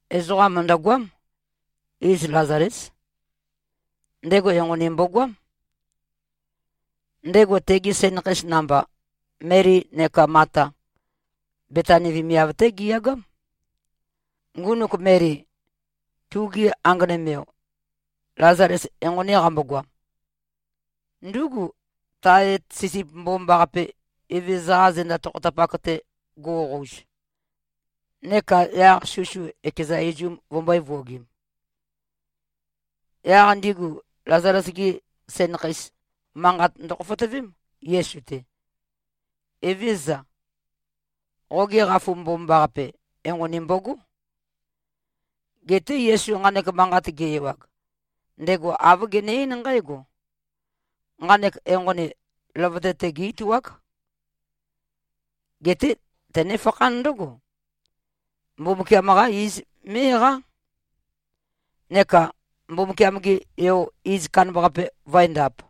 Ezoqa mø̀ndøgoám. Iz Lazalés. Ndego enqoni mbogoám. Ndego tegi sænakheis namba, Meli neka Mata, Betani vemiav-té giyagám. Ngunuk Meli, tuge anganøm-yo Lazales enqoni qambogoam, ndúgu, tae etet sisip mbomambaqape, Evezøza-qa zenda tokhotapak-te guoqouz neka yaq susu ekeza izum vømbø̄e-vuogim. Yaq ndigu Lazales-gi sænakheis manqat ndøkhoføtøvém, Yesu-te, “Evézøza, qoge qafu mbomambaqape, enqoni mbogó.” Geté Yesu nqanek manqat ge-ewag, ndego āv gene-eín nqǽgo, “Nqanek enqoni, løvøte-te gé-ituák. Geté tønefakhán ndǿgo, Mbumbukiam-qá iz mé꞉-eqá, neka Mbumbukiam-ge Yo, iz kandambaqape vø̄endāp.”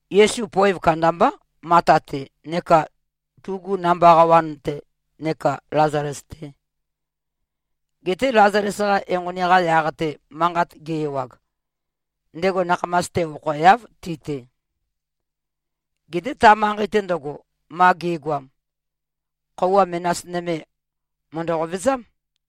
Yesu poev kandambá, Mata-te neka tugu namba qawan-te neka Lazales-te. Geté Lazales-qa enqoni-qa yaq-te manqat ge-ewag, ndego nakhamas-te okhoeáv ti-te. Geté ta manqei-te ndøgo, ma ge꞉goam, khøuwa menas nøme, mø̀ndø-qovezám.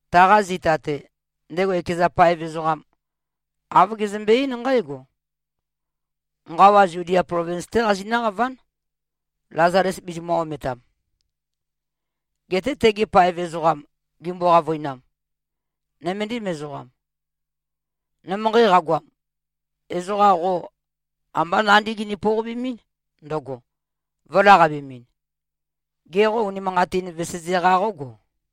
Taqa zita-te, ndego ekeza paev ezoqam, āv gezømbe-eín nqǽgo, “Nqawa Zudia plovins-té qazinǿ-qaván, Lazales bizimø̄-ometam.” Geté tegi paev ezoqam gimbo-qavøinam, “Nøméndim ezoqam. Nømønqei qagoam, ezoqa qo ambá nandí gini-pouqabemɨ́n ndøgo, vø̄laqabemɨn. Gê, qo unimanqatîn, veseze-qa qógo?”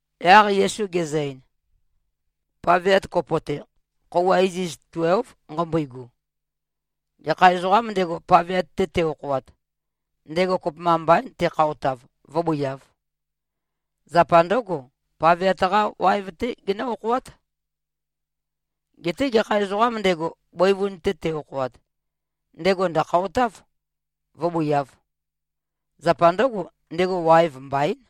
Yaq Yesu gezø-ein, “Paveat kopo-te, khøuwa iziz tuélv nqambøigu. Gekha ezoqām ndego, paveat-te te-okhoat, ndego kopømba mbaín tekhaotav, vǿbøiāv. Zapa ndǿgo, paveat-qá waev-té genǿ-okhoát. Geté gekha ezoqām ndego, bøivun-te te-okhoat, ndego ndø̀khaotáv, vǿboiāv. Zapa ndǿgo, ndego waev mbaín.”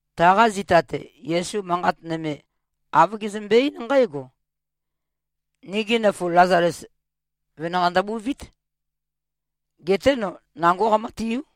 Taqa zita-te, Yesu manqat nøme, āv gezømbe-eín nqǽgo, “Nigi nøfu Lazales, venanqei ndøbuvít. Geté no nangó qamǿtiú.”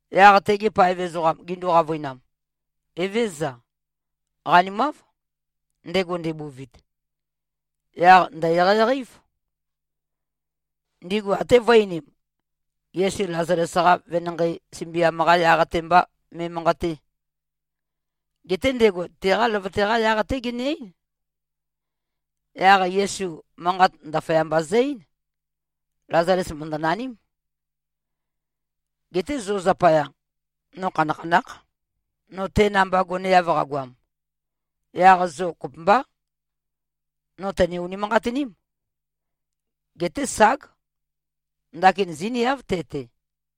Yaq tegi paev ezoqam gindu-qavøinam, “Evézøza. Qanimáv. Ndego ndebuvit, yaq ndø̀-eqeieqei-év.” Ndigu até vø̄e-einim, Yesu Lazales-qa venanqei sømbiam-qa yaq-te mba me꞉manqaté. Geté ndego teqa løvøte-qa yaq-té gene-eín. Yaq Yesu manqat ndaføyamba zø-eín, “Lazales mø̀ndønaním. Geté zo zapaya, no khanakhanákh, no te namba goneav qagoam. Yaq zo kopømbá, no tøne-unimanqatiním. Geté, ság. Ndakin zíniáv te-te.”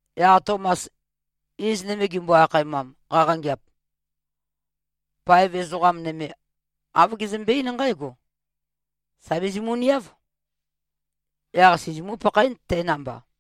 Yaq Tomas, iz nøme gimbo-akhaemam, qaqangeāp, paev ezoqa nøme āv gezømbe-eín nqǽgo, “Sà bizimuniáv. Yaq sizimú-pakhaén te namba.”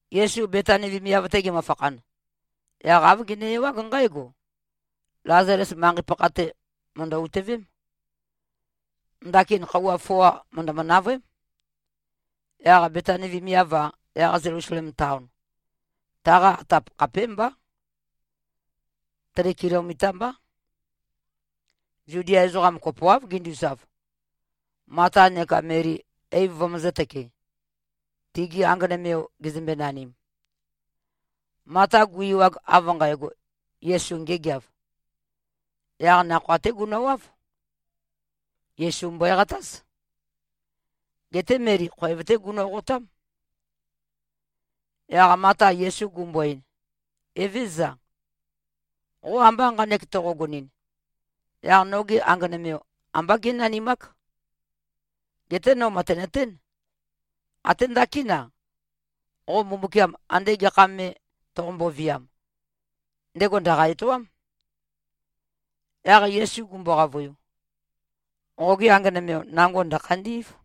Yesu Betani vemiav-te gemøfakhan, yaq āv gene-ewág nqǽgo: Lazales manqei-pakha-te mø̀ndø-utøvém. Ndakin khøuwa foa mø̀ndømø-navøém. Yaq Betani vemiav-a, yaq Zelusalem taon, taqa atap khapémbá. Tri kilomita mbá. Zudia ezoqam kopoáv ginduzav, Mata neka Meli eiv vømøzǿ-tøkē, tigi anganøm-yo gezømbe-nanim. Mata gu-ewag, av nqægo, Yesu ngêgeāv, yaq nakhoa-té gunøwáv. Yesu mbøeqatáz. Geté Meli khoev-té gunoqotám. Yaq Mata Yesu gumbo-ein, “Evézøza. Qo amba nqanek toqogonɨn, yaq noge anganøm-yo, ambá gé꞉nanimák. Geté no mø̀tenøtén, até ndakín-a, qo Mbumbukiam andē gekha mē toqombo-viam, ndego ndø̀qa-etoám.” Yaq Yesu gumbo-qavøiu, “Qoge anganøm-yo nango ndø̀khandí꞉v.”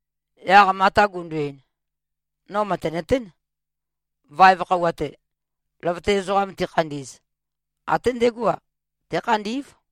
Yaq Mata gundu-ein, “No mø̀tenøtén. Vaev khøuwa-te, løvøte ezoqam tikhandi꞉z, até ndegó-a, tékhandí꞉v.”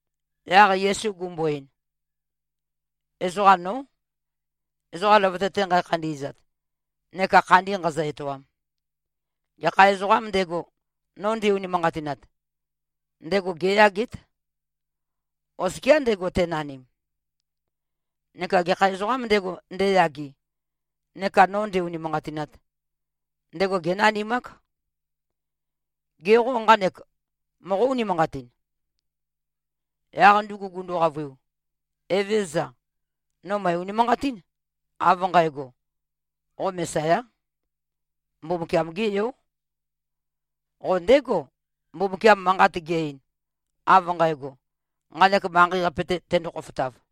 Yaq Yesu gumbo-ein, “Ezoqam nó, ezoqa løvøte-te nqækhandi꞉zat neka khandi nqāzø̄-ētōām. Gekha ezoqām ndego, no nde-unimanqatinat, ndego géyagét, oskia ndego tenanim. Neka gekha ezoqām ndego, ndeyage neka no ndē-ūnīmānqātīnāt, ndego génanimák. Gê, qo nqanek moqó-unimanqatin?” Yaq ndugu gundu-qavøiu, “Evézøza. No mø̀e-unimanqatín, av nqægo, qo Mesayá. Mbumbukiam-gé Yó. Qo ndégo, Mbumbukiam manqat ge-ein, av nqægo, nqanek manqei-qape-te tendo-khofotav.”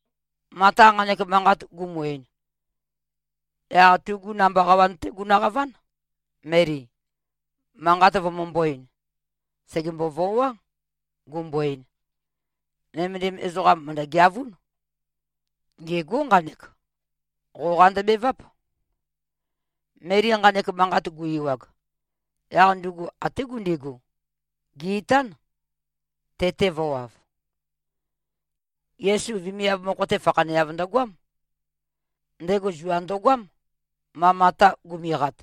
Mata nqanek manqat gumu-ein, yaq tugu namba qawan-té gunøqaván, Meli, manqat vømømbō-ein. Sègembo-voá, gumbo-ein, “Nømendim ezoqam mø̀ndø-geavún. Ngêgó nqanek. Qoqa ndøbeváp.” Meli nqanek manqat gu-ewag, yaq ndugu até gundigu, gè-itán, te-te vø̄wav. Yesu vemiav mokho-te fakhaneav ndøgoám. Ndego zua ndo꞉goám, ma Mata gumiqat.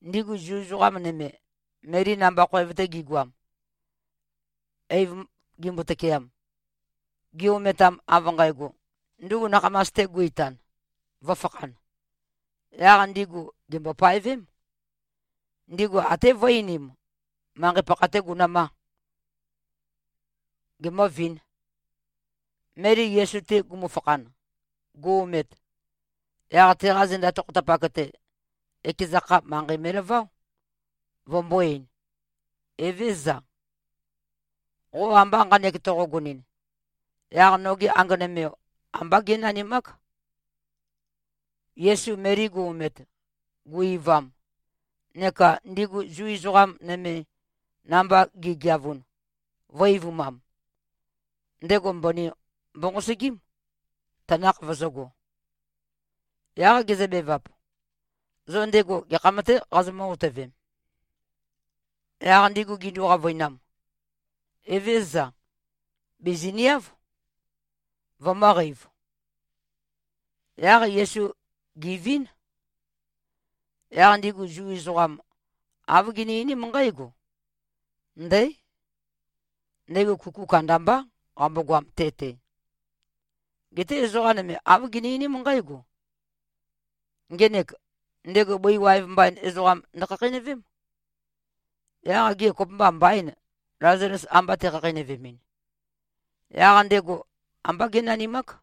Ndigu Zu ezoqa nøme, Meli namba khoev-te gigoam, eiv gimbo-tøkeam, gi-ometam, av nqægo, ndugu nakhamas-te gu-itan, vø̄fakhan, yaq ndigu gèmbo-paevém. Ndigu até vø̄e-einim, manqei pakha-tē gunø̄mā. Gemø̄vīn. Meli Yesu-te gumufakhan, gu-omet, yaq teqa zenda tokhotapak-te, ekeza kha, manqei me꞉laváo, vømbō-ein, “Evézøza. Qo amba nqanek toqogonɨn, yaq noge anganøm-yo ambá gé꞉nanimák.” Yesu Meli gu-omet, gu-eivam, neka ndigu Zu ezoqa nøme, namba gi꞉geavun, vø̄-eivumam, ndego mbøni mbonqosøgím, tanakh vøzø̄go. Yaq gezøbevap, “Zo ndego gekham-tē qazomǿ-otøvem?” Yaq ndigu gindu-qavøinam, “Evézøza. Bìziniáv, vømø̄qeiv.” Yaq Yesu gèvín. Yaq ndigu Zu ezoqam, āv gini-einím nqǽgo, “Ndǽ! Ndego kuku kandambá qambogoam te-te.” Geté ezoqa nøme āv gini-einím nqǽgo, “Ngenek, ndego bøi waev mbain ezoqam ndøkhakheinøvém. Yaq gê, kopømba mbaîn, Lazales amba tekhakheinøvemɨn? Yaq ndego ambá génanimák.”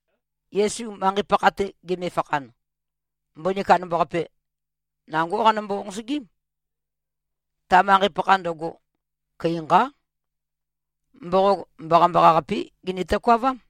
Yesu manqei-pakha-te gemefakhan, mbøni kandambaqape, nangó qanømbo-nqosøgím. Ta manqei-pakha ndøgo, køi nqá. Mboqog mbaqambaqa-qapé gini-tokavám.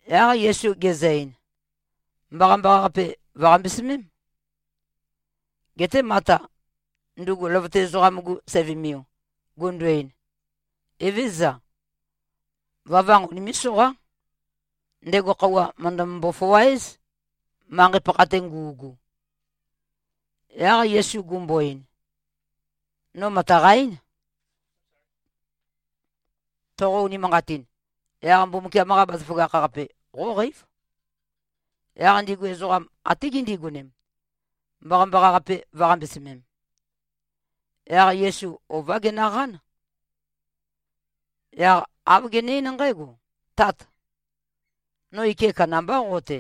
Yaq Yesu gezø-ein, “Mbaqambaqa-qape vø̀-qambesømém.” Geté Mata, ndugu løvøte ezoqam-gu sævømiu, gundu-ein, “Evézøza. Vøvanq unimé꞉-soqá. Ndego khøuwa mø̀ndømbo-foa-éz, manqei-pakha-te ngu꞉gu.” Yaq Yesu gumbo-ein, “No mø̀taqa-eín. Toqo-unimanqatin, yaq Mbumbukiam-qa bazaføgakh-qape qóqeív.” Yaq ndigu ezoqam até gindigonem, mbaqambaqa-qape vø̄-qambesømem. Yaq Yesu ová genøqán. Yaq āv gene-eín nqǽgo, “Tát! No ike kandambá qo-te.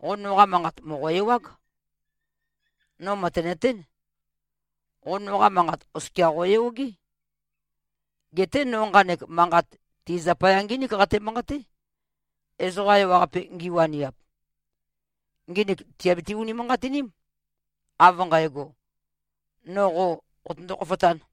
Qo noqa manqat, mòqo-ewág. No mø̀tenøtén, qo noqa manqat oskia qòyogé. Geté no nqanek manqat ti zapaya ngínik qate-manqaté, ezoqa ewaqape ngiwaniap. Nginik tìabiti-unimanqatiním, av nqægo, no qo qotøndo-khofotán.”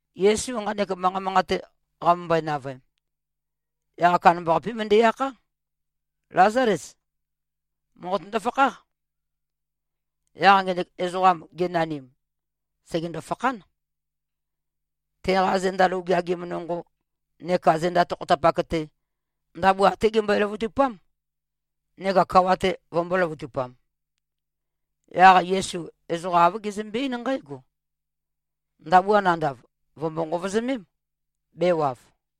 Yesu nqanek manqa manqate qamømbøe-navøem, yaq kandambaqapé møndæ-akhá, “Lázales. Mòqotøndo-fakháq!” Yaq ngenek ezoqam, genanim, sègendo-fakhán. Teqa zenda lou geagim nonqo neka zenda tokhotapak-te, ndabua até gembøe-løvøtupám, neka kawa-te vømbō-løvøtupam. Yaq Yesu ezoqa āv gezømbe-eín nqǽgo, “Ndabua nandav, vø̀mbo-nqovozømém, bēwav.”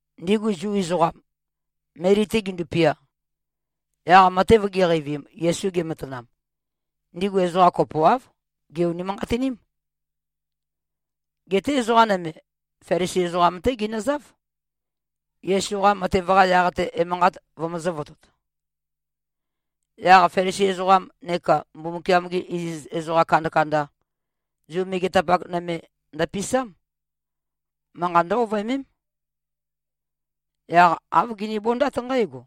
Ndigu Zu ezoqam, Meli-te gindupia, yaq matev giqeivim, Yesu gematanam, ndigu ezoqa kopoáv, gè-unimanqatiním. Geté ezoqa nøme, Felisi ezoqam-té ginøzáv, Yesu-qa matev-qa yaq-te, emanqat vømøzø̄-votot. Yaq Felisi ezoqam neka Mbumbukiam-gi iziz ezoqa kandakanda, Zu megetapak nøme ndøpisám. Manqa ndǿ-ovøemém. Yaq āv ginibondát nqǽgo,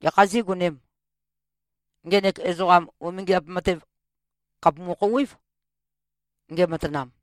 “Gekhā zígonēm? Ngenek ezoqam, umingiap matev khàpumu-khouwév, ngematanam.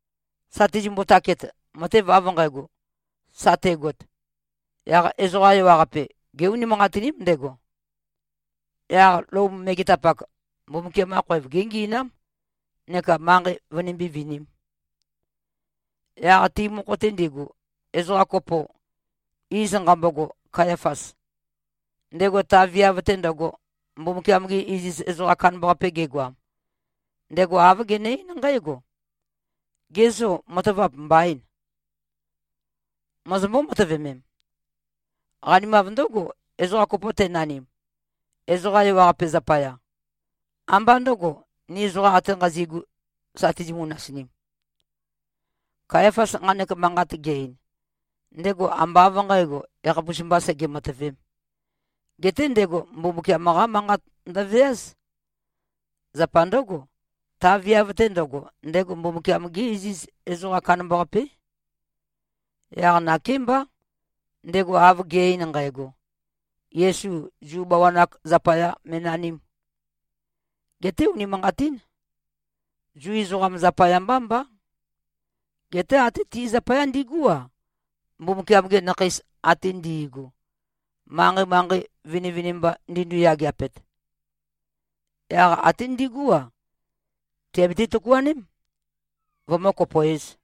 Sa tizimbo-taket, matev av nqægo sa tegot, yaq ezoqa ewaqape gé-unimanqatiním ndego. Yaq Lom megetapak, Mbumbukiam-qa khoev géngi꞉nám neka manqei vønimbí-vinīm.” Yaq ti mokho-te ndigu, ezoqa kopo, iz nqambogo Kayafas, ndego ta viav-te ndøgo Mbumbukiam-ge iziz ezoqam kandambaqape gegoam, ndego āv gene-eín nqǽgo, “Ge zô, matavap mbaîn? Mozombó-matøvemem? Qanimav ndǿgo, ezoqa kopo tenanim, ezoqa ewaqape zapaya, ambá ndøgo, ni ezoqam ate nqazi꞉gu, sa tizimu-nasinim.” Kayafas nqanek manqat ge-ein, ndego ambá av nqǣgo, yakhapus mbā sege-matøvēm. Geté ndego Mbumbukiam-qá manqat ndøveáz. Zapa ndǿgo, ta viav-te ndøgo, ndego Mbumbukiam-gé iziz ezoqam kandambaqapé. Yaq nakémbá, ndego av ge꞉-ein nqægo, Yesu Zu bawan-ak zapaya mē꞉nanīm. Geté unimanqatín, Zu ezoqam zapaya mbá mbá. Geté até ti zapaya ndigú-a, Mbumbukiam-gi nakheis ate ndi꞉gu, manqei-manqei vinivinimba ndindu-yageapet. Yaq até ndigú-a, tìabiti-tøkuaném, vømǿ-kopoēz.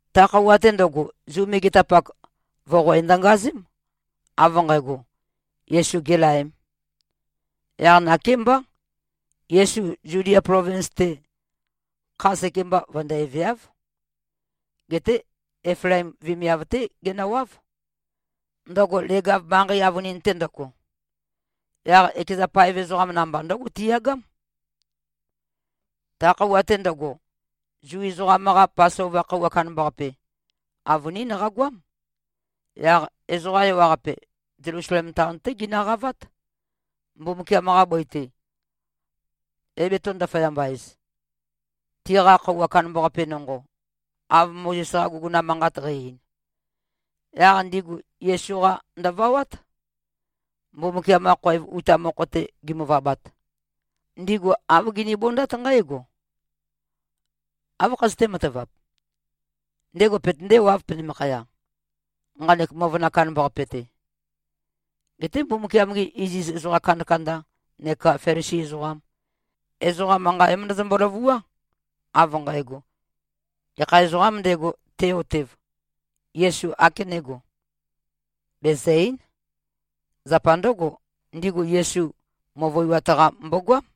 Ta khøuwa-te ndøgo, Zu megetapak voqoe ndøngazém, av nqægo, Yesu gēlaēm. Yaq nakémbá, Yesu Zudia plovins-te, kha sekemba vøndæveáv. Geté Eflaim vemiav-té genøwáv, ndøgo leg-av manqei avønin-te ndøgo. Yaq ekeza paev ezoqam namba, ndǿgo tiyagám. Ta khøuwa-te ndøgo, Zu ezoqam-qa Pasova khøuwa kandambaqape, avønín qagoám. Yaq ezoqa ewaqape, Zelusalem taon-té ginøqavát, Mbumbukiam-qa bøi-te, é-betō-ndaføyamba-ez, tiqa khøuwa kandambaqape nonqo, av Mozes-qa guguna manqat qæ-ein. Yaq ndigu Yesu-qa ndøvawát. Mbumbukiam-qa khoev uta mokho-te gimøvabat, ndigu āv ginibondát nqǽgo, “Áv khazøté-matavap? Ndego petøndéwāv penømakhaya, nqanek møvøna kandambaqape-te?” Geté Mbumbukiam-gi iziz ezoqa kandakanda neka Felisi ezoqam, ezoqa manqa é-møndøzømbo-løvuá, av nqægo, gekha ezoqām ndego, te-otev, Yesu ākenégo, bèzø-eín. Zapa ndǿgo, ndigu Yesu møvøiwat-qa mbogoám.